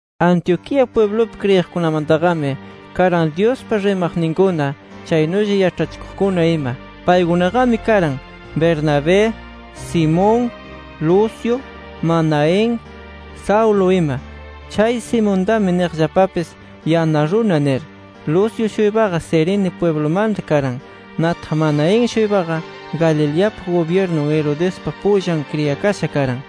Antioquía pwiblupi kriyiqkunamantaqami karan Dyuspa rimaqninkuna, chaynulla yaĉhachikuqkuna ima. Paykunaqami karan Bernabé, Simón, Lucio, Manaén, Saulo ima. Chay Simontami niqllapapis, “Yana Runa” nir. Lucio-shuypaqa Cirene pwiblumanta karan. Nataq Manaén-shuypaqa, Galileapa gubyirnun Herodespa pullan kriyakasha karan.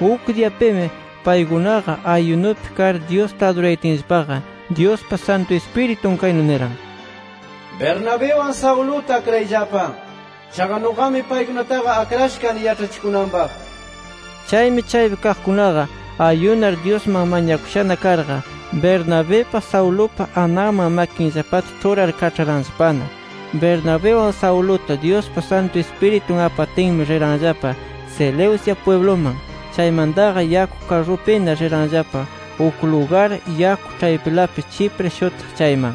Uk diyapimi paykunaqa ayunupi kar Dyusta adurayatinllapaqa, Dyuspa Santu Ispiritun kaynu niran: “Bernabiwan Sauluta, akrayllapa. Chaqa nuqami paykunataqa akrasha kani yaĉhachikunanpaq” nir. Chaymi chaypi kaqkunaqa ayunar, Dyusman mañakushana karqa, Bernabipa, Saulupa ananman makinllapata ĉhurar, kaĉharanllapana. Bernabiwan Sauluta, Dyuspa Santu Ispiritun apatinmi, riranllapa Seleucia pwibluman. Chaymantaqa, yaku karrupina riranllapa uk lugar yaku ĉhaypilapi Chipre shutiq chayman.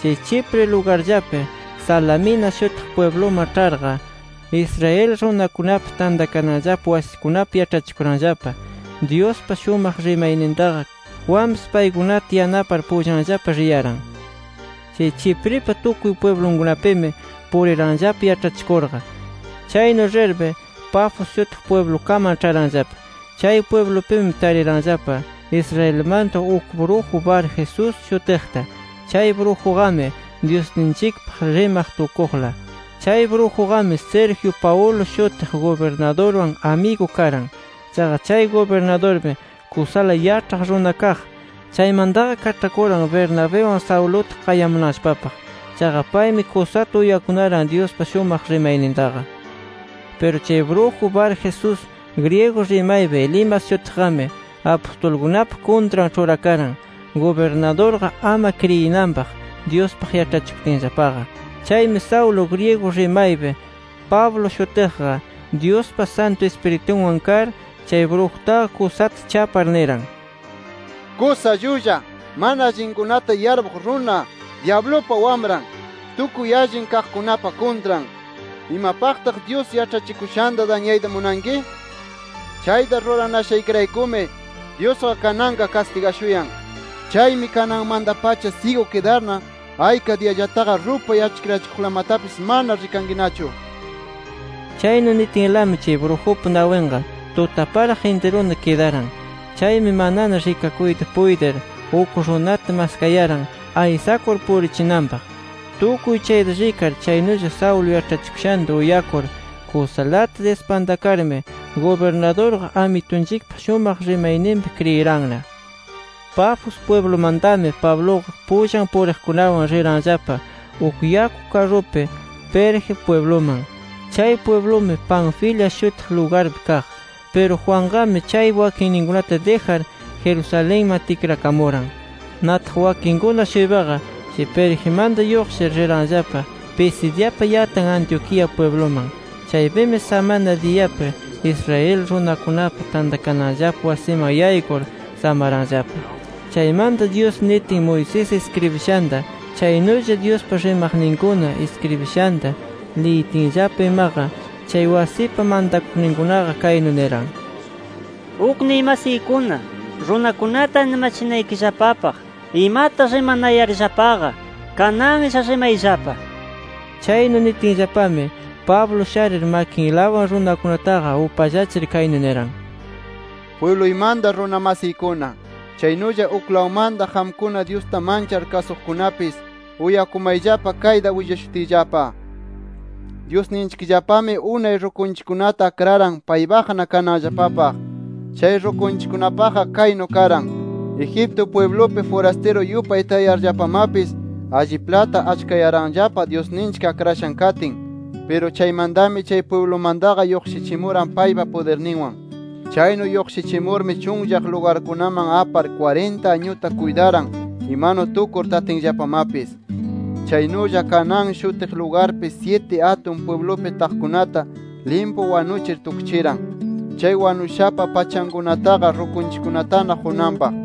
Chay Chipre lugarllapi Salamina shutiq pwibluman ĉharqa, Israel runakunapa tantakananllapa wasikunapi, yaĉhachikuranllapa Dyuspa shumaq rimaynintaqa. Juanpis paykunata yanapar pullanllapa riyaran. Chay Chipripa tukuy pwiblunkunapimi puriranllapa yaĉhachikurqa. Chaynu rirmi Pafos shutiq pwiblukaman ĉharanllapa. Chay pwiblupimi tariranllapa Israelmanta uk bruju Barjesús shutiqta. Chay brujuqami Dyusninchikpaq rimaq tukuqla. Chay brujuqami, Sergio Paulo shutiq gubirnadurwan amigu karan. Chaqa chay gubirnadurmi kusala yaĉhaq runa kaq. Chaymantaqa kaĉhakuran Bernabiwan Sauluta qayamunanllapapaq. Chaqa paymi kusata uyakunaran Dyuspa shumaq rimaynintaqa. Piru chay bruju Barjesús, griego rimaypi Elimas shutiqqami, apustulkunapa kuntran ĉhurakaran, gubirnadurqa ama kriyinanpaq Dyuspaq yaĉhachikutinllapaqa. Chaymi Saulo, griego rimaypi Pablo shutiqqa, Dyuspa Santu Ispiritunwan kar, chay brujutaqa kusata chapar niran: —¡Kusa llulla, mana allinkunata yarpuq runa, dyablupa wamran, tukuy allin kaqkunapa kuntran! ¿Imapaqtaq Dyus yaĉhachikushanta dañayta munanki? Chayta ruranashaykiraykumi Dyusqa kananqa kastigashuyan. Chaymi kananmanta-pacha syigu kidarna, ayka diyallataqa rupay achkirachikuqlamatapis mana rikankinachu nir. Chaynu nitinlami chay brujupa nawinqa tutaparaq intiruna kidaran. Chaymi manana rikakuyta puytir, uk runata maskayaran aysakur purichinanpaq. Tukuy chayta rikar, chaynulla Saulo yaĉhachikushanta uyakur kusalata dispantakarmi gubirnadurqa Amitunchikpa shumaq rimayninpi kriyiranna. Pafos pwiblumantami Pabluqa, pullan puriqkunawan riranllapa uk yaku karrupi Perge pwibluman. Chay pwiblumi, Panfilia shutiq lugarpi kaq. Piru Juanqami chaypi wakinninkunata dijar, Jerusalenman tikrakamuran. Nataq wakinninkuna-shuypaqa, chay Pergimanta lluqshir, riranllapa Pisidiapa yatan Antioquía pwibluman. Chaypimi samana diyapi Israel runakunapa tantakananllapa wasiman yaykur, samaranllapa. Chaymanta, Dyus nitin Moisés iskribishanta, chaynulla Dyuspa rimaqninkuna iskribishanta liyitinllapa imaqa, chay wasipa mantakuqninkunaqa kaynu niran: —Ukniy masiykuna, runakunata animachinaykillapapaq imata rimanayarllapaqa, kananlla rimayllapa nir. Chaynu nitinllapami, Pablo sharir makinlawan runakunataqa upallachir, kaynu niran: —Pwibluymanta runa masiykuna, chaynulla uklawmanta qamkuna, Dyusta manchar kasuqkunapis, uyakumayllapa kayta willashutiyllapa: Dyusninchikllapami, unay rukunchikkunata akraran paypaqna kananllapapaq. Chay rukunchikkunapaqqa kaynu karan: Egipto pwiblupi furastiru yupay tayarllapamapis, alliplata achkayaranllapa Dyusninchik akrashan katin. Piru chaymantami chay pwiblumantaqa lluqshichimuran paypa pudirninwan. Chaynu lluqshichimurmi, chunllaq lugarkunaman apar kwarinta añuta kuytaran imanu tukur tatinllapamapis. Chaynulla, Canaán shutiq lugarpi, syiti atun pwiblupi taqkunata limpu wanuchir tukchiran, chay wanushapa pachankunataqa rukunchikkunatana qunanpaq.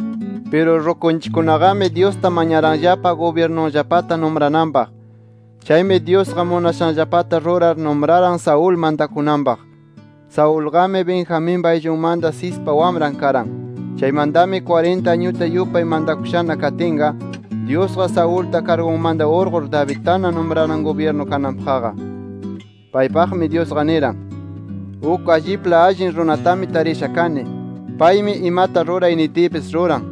Piru rukunchikkunaqami Dyusta mañaranllapa gubyirnunllapata numrananpaq. Chaymi Dyusqa munashanllapata rurar, numraran Saúl mantakunanpaq. Saulqami, Benjaminpa ayllunmanta, Cispa wamran karan. “Chaymantami kwarinta añuta yupay mantakushana katinqa, Dyusqa, Saulta kargunmanta urqur, Davidtana numraran, gubyirnu kananpaqqa. Paypaqmi Dyusqa niran: Uk allipla allin runatami tarisha kani. Paymi imata ruray nitiypis, ruran.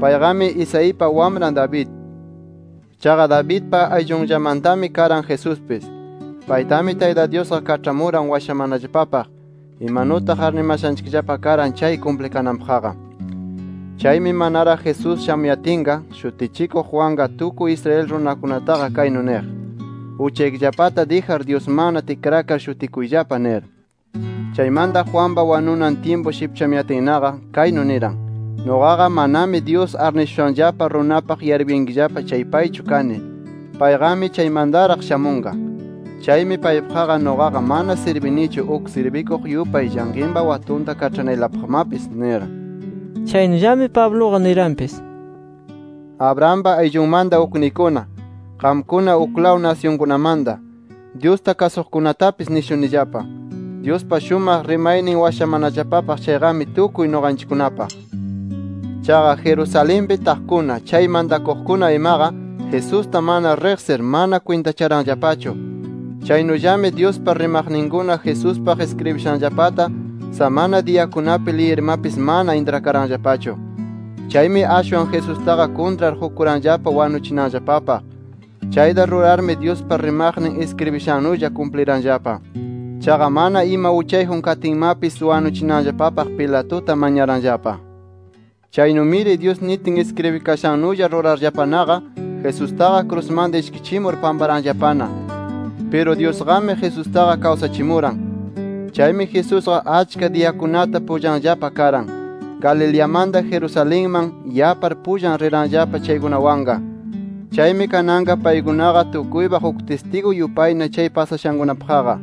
Payqami Isaipa wamran David. Chaqa Davidpa ayllunllamantami karan Jesuspis. Paytami Tayta Dyusqa kaĉhamuran washamanallapapaq, imanutaq arnimashanchikllapa karan chay kumplikananpaqqa. Chaymi manaraq Jesús shamuyatinqa, Shutichikuq Juanqa tukuy Israel runakunataqa kaynu niq: Uchaykillapata dijar, Dyusmanna tikrakar shutikuyllapa nir. Chaymanta Juanpa wanunan tyimpu shipchamuyatinnaqa, kaynu niran: ‘Nuqaqa manami Dyus arnishushanllapa runapaq yarpuyankillapa chay paychu kani. Payqami chaymantaraq shamunqa. Chaymi paypaqqa nuqaqa mana sirbinichu uk sirbikuq yupay llanqinpa watunta kaĉhanaylapaqmapis’ nir”. Chaynullami Pabluqa niranpis: “Abrahampa ayllunmanta ukniykuna, qamkuna uklaw nasyunkunamanta Dyusta kasuqkunatapis nishunillapa: Dyuspa shumaq rimaynin washamanallapapaq chayqami tukuy nuqanchikkunapaq. Chaqa, Jerusalenpi taqkuna, chay mantakuqkuna imaqa, Jesusta mana riqsir, mana kwintacharanllapachu. Chaynullami Dyuspa rimaqninkuna Jesuspaq iskribishanllapata, samana diyakunapi liyirmapis, mana intrakaranllapachu. Chaymi ashwan Jesustaqa kuntrar qukuranllapa wanuchinanllapapaq. Chayta rurarmi Dyuspa rimaqnin iskribishannulla kumpliranllapa. Chaqa mana ima uchayjun katinmapis wanuchinanllapapaq, Pilatuta mañaranllapa. Chaynumiri Dyus nitin iskribikashannulla rurarllapanaqa, Jesustaqa krusmanta ishkichimur pamparanllapana. Piru Dyusqami Jesustaqa kawsachimuran. Chaymi Jesusqa, achka diyakunata pullanllapa karan, Galileamanta Jerusalenman yapar pullan riranllapa chaykunawanqa. Chaymi kananqa paykunaqa tukuypaq uk tistigu yupayna chay pasashankunapaqqa.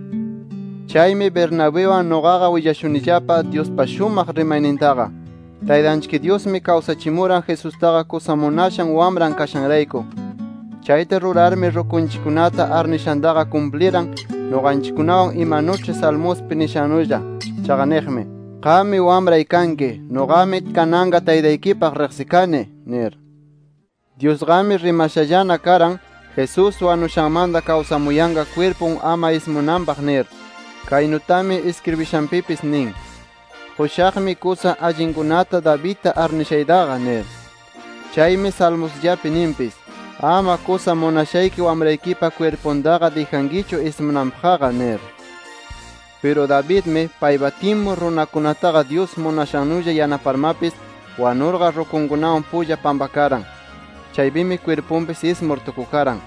“Chaymi Bernabiwan nuqaqa willashunillapa Dyuspa shumaq rimaynintaqa: Taytanchik Dyusmi kawsachimuran Jesustaqa kusa munashan Wamran kashanrayku. Chayta rurarmi rukunchikkunata arnishantaqa kumpliran, nuqanchikkunawan, imanuĉhi Salmospi nishannulla. Chaqa niqmi: ‘Qammi Wamray kanki. Nuqami kananqa Taytaykipaq riqsikani’ nir. Dyusqami rimashallana karan, Jesús wanushanmanta kawsamuyanqa kwirpun ama ismunanpaq nir. Kaynutami, iskribishanpipis nin: ‘Qushaqmi kusa allinkunata Davidta arnishaytaqa’ nir. Chaymi Salmosllapi ninpis: ‘Ama kusa munashayki Wamraykipa kwirpuntaqa dijankichu ismunanpaqqa’ nir. “Piru Davidmi, paypa tyimpun runakunataqa Dyus munashannulla yanaparmapis, wanurqa rukunkunawan pulla pampakaran. Chaypimi kwirpunpis ismur tukukaran.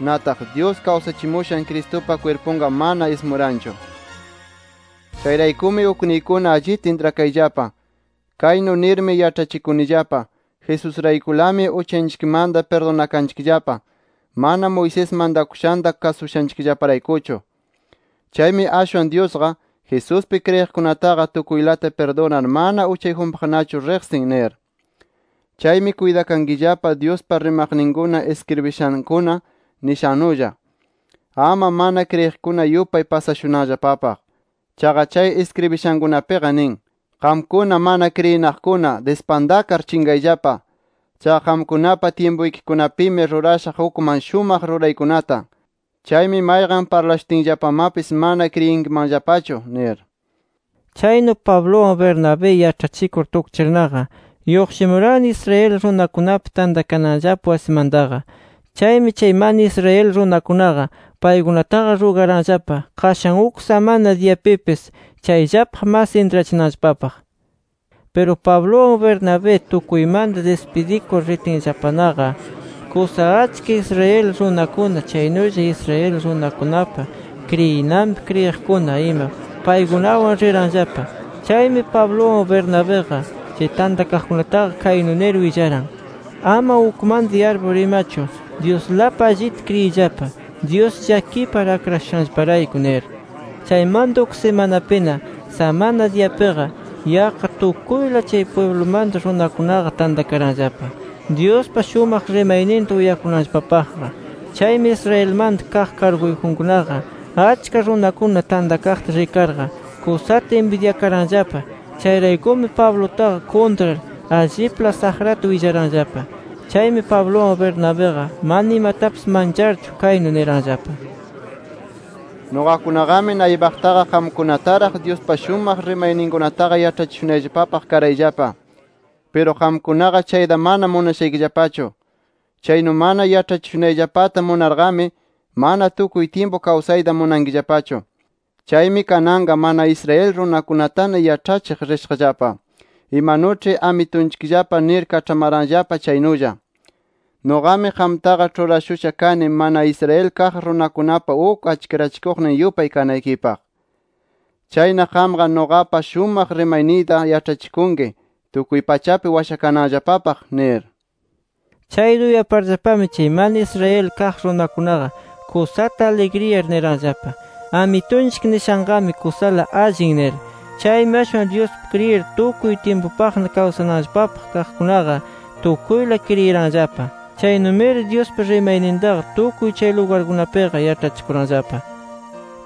Nataq, Dyus kawsachimushan Cristupa kwirpunqa mana ismuranchu. “Chayraykumi ukniykuna allita intrakayllapa, kaynu nirmi yaĉhachikunillapa: Jesusraykulami uchanchikmanta pirdunakanchikllapa, mana Moisés mantakushanta kasushanchikllaparaykuchu. Chaymi ashwan Dyusqa, Jesuspi kriyiqkunataqa tukuylata pirdunar, mana uchayjunpaqnachu riqsin nir. “Chaymi kuytakankillapa Dyuspa rimaqninkuna iskribishankuna nishannulla, ama mana kriyiqkuna yupay pasashunanllapapaq. Chaqa chay iskribishankunapiqa nin: ‘¡Qamkuna mana kriyinaqkuna, dispantakar chinqayllapa! Chaqa qamkunapa tyimpuykikunapimi rurashaq ukman shumaq ruraykunata. Chaymi mayqan parlashutinllapamapis, mana kriyinkimanllapachu’ nir”. Chaynu Pabluwan Bernabé yaĉhachikur tukchirnaqa, lluqshimuranna Israel runakunapa tantakananllapa wasimantaqa. Chaymi chay mana Israel runakunaqa, paykunataqa rugaranllapa qashan uk samana diyapipis chayllapaq mas intrachinanllapapaq. Piru Pabluwan Bernabé, tukuymanta dispidikur, ritinllapanaqa, kusa achka Israel runakuna, chaynulla Israel runakunapa kriyinanpi kriyiqkuna ima paykunawan riranllapa. Chaymi Pabluwan Bernabiqa, chay tantakaqkunataqa kaynu nir willaran: “Ama ukmanta yarpur imachu Dyuslapi allita kriyiyllapa, Dyus llakipar akrashushanllaparayku” nir. Chaymanta uk simanapina, samana diyapiqa yaqqa tukuyla chay pwiblumanta runakunaqa tantakaranllapa, Dyuspa shumaq rimayninta uyakunanllapapaqqa. Chaymi Israelmanta kaq karguyjunkunaqa, achka runakuna tantakaqta rikarqa, kusata inbidyakaranllapa. Chayraykumi Pablutaqa kuntrar allipla saqrata willaranllapa. Chaymi Pabluwan Bernabiqa mana imatapis mancharchu kaynu niranllapa: —Nuqakunaqami naypaqtaqa qamkunataraq Dyuspa shumaq rimayninkunataqa yaĉhachishunayllapapaq karayllapa. Piru qamkunaqa chayta mana munashaykillapachu. Chaynu mana yaĉhachishunayllapata munarqami, mana tukuy tyimpu kawsayta munankillapachu. Chaymi kananqa mana Israel runakunatana yaĉhachiq rishaqllapa, imanuĉhi Amitunchikllapa nir kaĉhamaranllapa chaynulla: ‘Nuqami qamtaqa ĉhurashusha kani mana Israel kaq runakunapa uk achkirachikuqnin yupay kanaykipaq. Chayna qamqa nuqapa shumaq rimayniyta yaĉhachikunki tukuy pachapi washakananllapapaq’ nir. Chayta uyaparllapami, chay mana Israel kaq runakunaqa, kusata aligriyar, niranllapa: “Amitunchik nishanqami kusala allin” nir. Chaymi ashwan Dyuspi kriyir tukuy tyimpupaqna kawsananllapapaq kaqkunaqa, tukuyla kriyiranllapa. Chaynumiri Dyuspa rimaynintaqa tukuy chay lugarkunapiqa yaĉhachikuranllapa.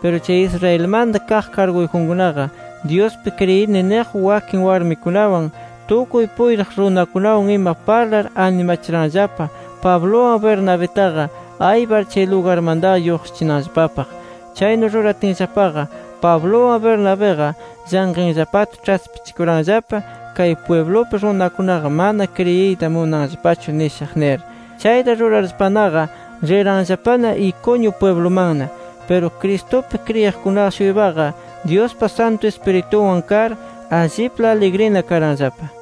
Piru chay Israelmanta kaq karguyjunkunaqa Dyuspi kriyini niq wakin warmikunawan, tukuy puytiq runakunawan ima parlar animachiranllapa, Pabluwan Bernabitaqa aypar chay lugarmantaqa lluqshichinanllapapaq. Chaynu ruratinllapaqa Pabluwan Bernabiqa llanqinllapata ĉhaspichikuranllapa, kay pwiblupi runakunaqa mana kriyiyta munanllapachu nishaq nir. Chayta rurarllapanaqa riranllapana Iconio pwiblumanna. Piru Cristupi kriyiqkuna-shuypaqa, Dyuspa Santu Ispiritunwan kar, allipla aligrina karanllapa.